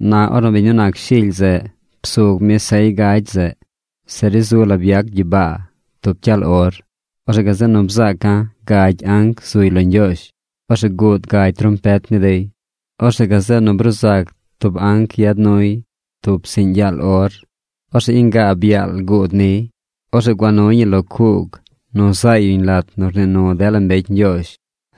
Na ornu biñ nu nac Shily zeꞌ psug mi sey gagy zeꞌ, se ri zu la byac gyibaa tub cyaal or. Orzeꞌ gazeꞌ nu bzaaca̱ gagy anc zuy lo Ñgyoozh. Orzeꞌ guud gagy trompet ni dey. Orzeꞌ gazeꞌ nu bruu zac tub anc yad nuy tub psiꞌñ yaal or. Orzeꞌ ingaab yaal guud niy. Orzeꞌ gua nuy ñi lo cuug nu zaay yuñ lat nu rnii nu dela mbecy Ñgyoozh.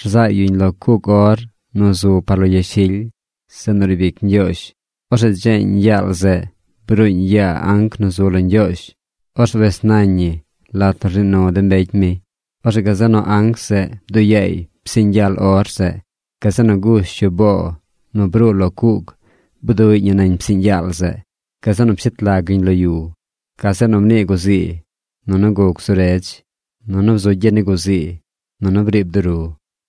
Rzaay yuñ lo cuug or nu zu par lo yashily, zeꞌ nu riib ic Ñgyoozh. Orzeꞌ dzeeñ yaal zeꞌ bruuñ yaa anc nu zu lo Ñgyoozh, orzeꞌ wes nañ ñi lat nu rnii nu de mbecy mi. Orzeꞌ gazeꞌ nu anc zeꞌ bduꞌ yaay psiꞌñ yaal or zeꞌ. Gazeꞌ nu gush yu boo nu bruu lo cuug, bduꞌy ñi nañ psiꞌñ yaal zeꞌ. Gazeꞌ nu pshet lag yuñ lo yu. Gazeꞌ nu mnii guzii. Nunu guc zu redz. Nunu bzu gyi ni guzii. Nunu briib duru.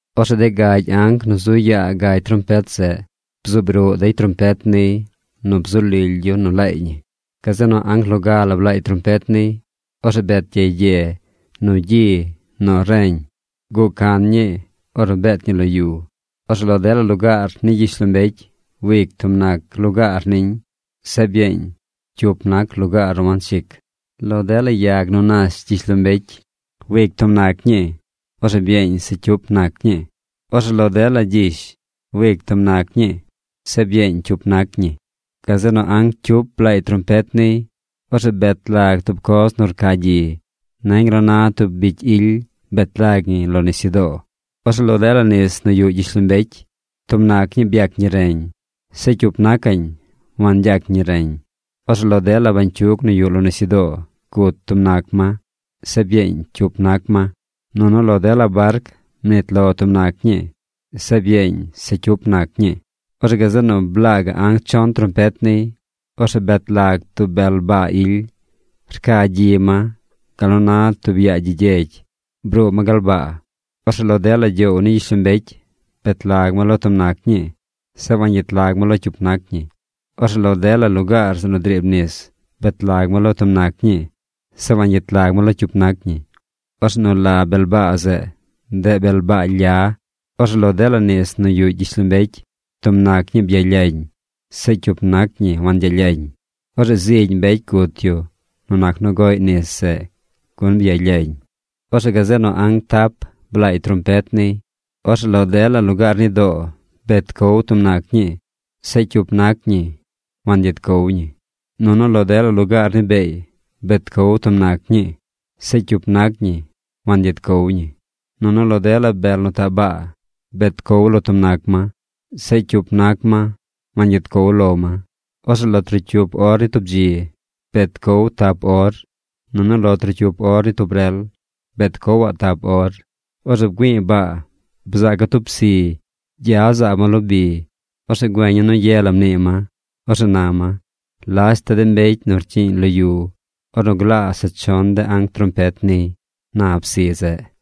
Orzeꞌ de gagy anc nu zu yaa gagy trompet zeꞌ bzuub ruꞌ dey trompet niy nu bzu lily yu nu laay ñi. Gazeꞌ nu anc loga blaay trompet niy. Orzeꞌ bet gyey gye, nu gyi, nu reñ. Guꞌ can ñii ornu beet ñi lo yu. Orzeꞌ lo dela lugaar ni gyishlombecy, wic tub ga nac lugaar niñ. Zeꞌ byeeñ cyup nac lugaar nu wanchic. Lo dela yag nu nash gyishlombecy, wic tub nac ñii. Orzeꞌ byeeñ se cyup nac ñii. Orzeꞌ lo dela gyish, wic tub nac ñii. Zeꞌ byeeñ cyup nac ñii. Gazeꞌ nu anc cyup blaay trompet niy. Orzeꞌ bet lag tub coz nu rca gyi. Nañ gal nu na tub bicy ily. Bet lag ñi lo nisyudoo. Orzeꞌ lo dela nis nu yuꞌ gyishlombecy, tub nac ñii byac ñi reñ. Zeꞌ cyup nacaꞌñ wangyac ñi reñ. Orzeꞌ lo dela bañcyug nu yuꞌ lo nisyudoo, gut tub nac ma. Zeꞌ byeeñ cyup nac ma. Nunu lo dela barc, mnit lo tub nac ñii. Zeꞌ byeeñ se cyup nac ñii. Orzeꞌ gazeꞌ nu blaa gaꞌ anc chon trompet niy. Orzeꞌ bet lag tub bel baa ily. Rca gyi ma gal nu na tub yaa gyi gyegy. Bruu ma gal baa. Orzeꞌ lo dela gyoow ni gyishlombecy, bet lag ma lo tub nac ñii. Zeꞌ wangyet lag ma lo cyup nac ñii. Orzeꞌ lo dela lugaar zeꞌ nu driib nis, bet lag ma lo tub nac ñii. Zeꞌ wangyet lag ma lo cyup nac ñii. Orzeꞌ nu la bel baa zeꞌ, ndeꞌ Bel Baa Lya. Orzeꞌ lo dela nis nu yuꞌ gyishlombecy, tub nac ñii byalyañ. Zeꞌ cyup nac ñii wangyalyañ. Orzeꞌ zigy mbecy gut yu nu nac nu goꞌy nis zeꞌ, gun byalyañ. Orzeꞌ gazeꞌ nu anc tap blaay trompet niy. Orzeꞌ lo dela lugaar ni doo, bet cow tub nac ñii. Zeꞌ cyup nac ñii wangyet cow ñi. Nunu lo dela lugaar ni beey, bet cow tub nac ñii. Zeꞌ cyup nac ñii wangyet cow ñi. Nunu lo dela bel nu taꞌ baa bet cow lo tub nac ma. Zeꞌ cyup nac ma wangyet cow lo ma. Orzeꞌ lo trocyup or ni tub dzi, bet cow tap or. Nunu lo trocyup or ni tub rel, bet cowaꞌ tap or. Orzeꞌ bgüi̱i̱ baa. Bzaaca̱ tub psi. Gya zaab ma lo bi. Orzeꞌ güeña̱ nu ye la mnii ma. Orzeꞌ na ma: ―¡Lashta de mbecy nu rcyiiñ lo yu ornu glaa se chon de anc trompet niy! ―na psi zeꞌ.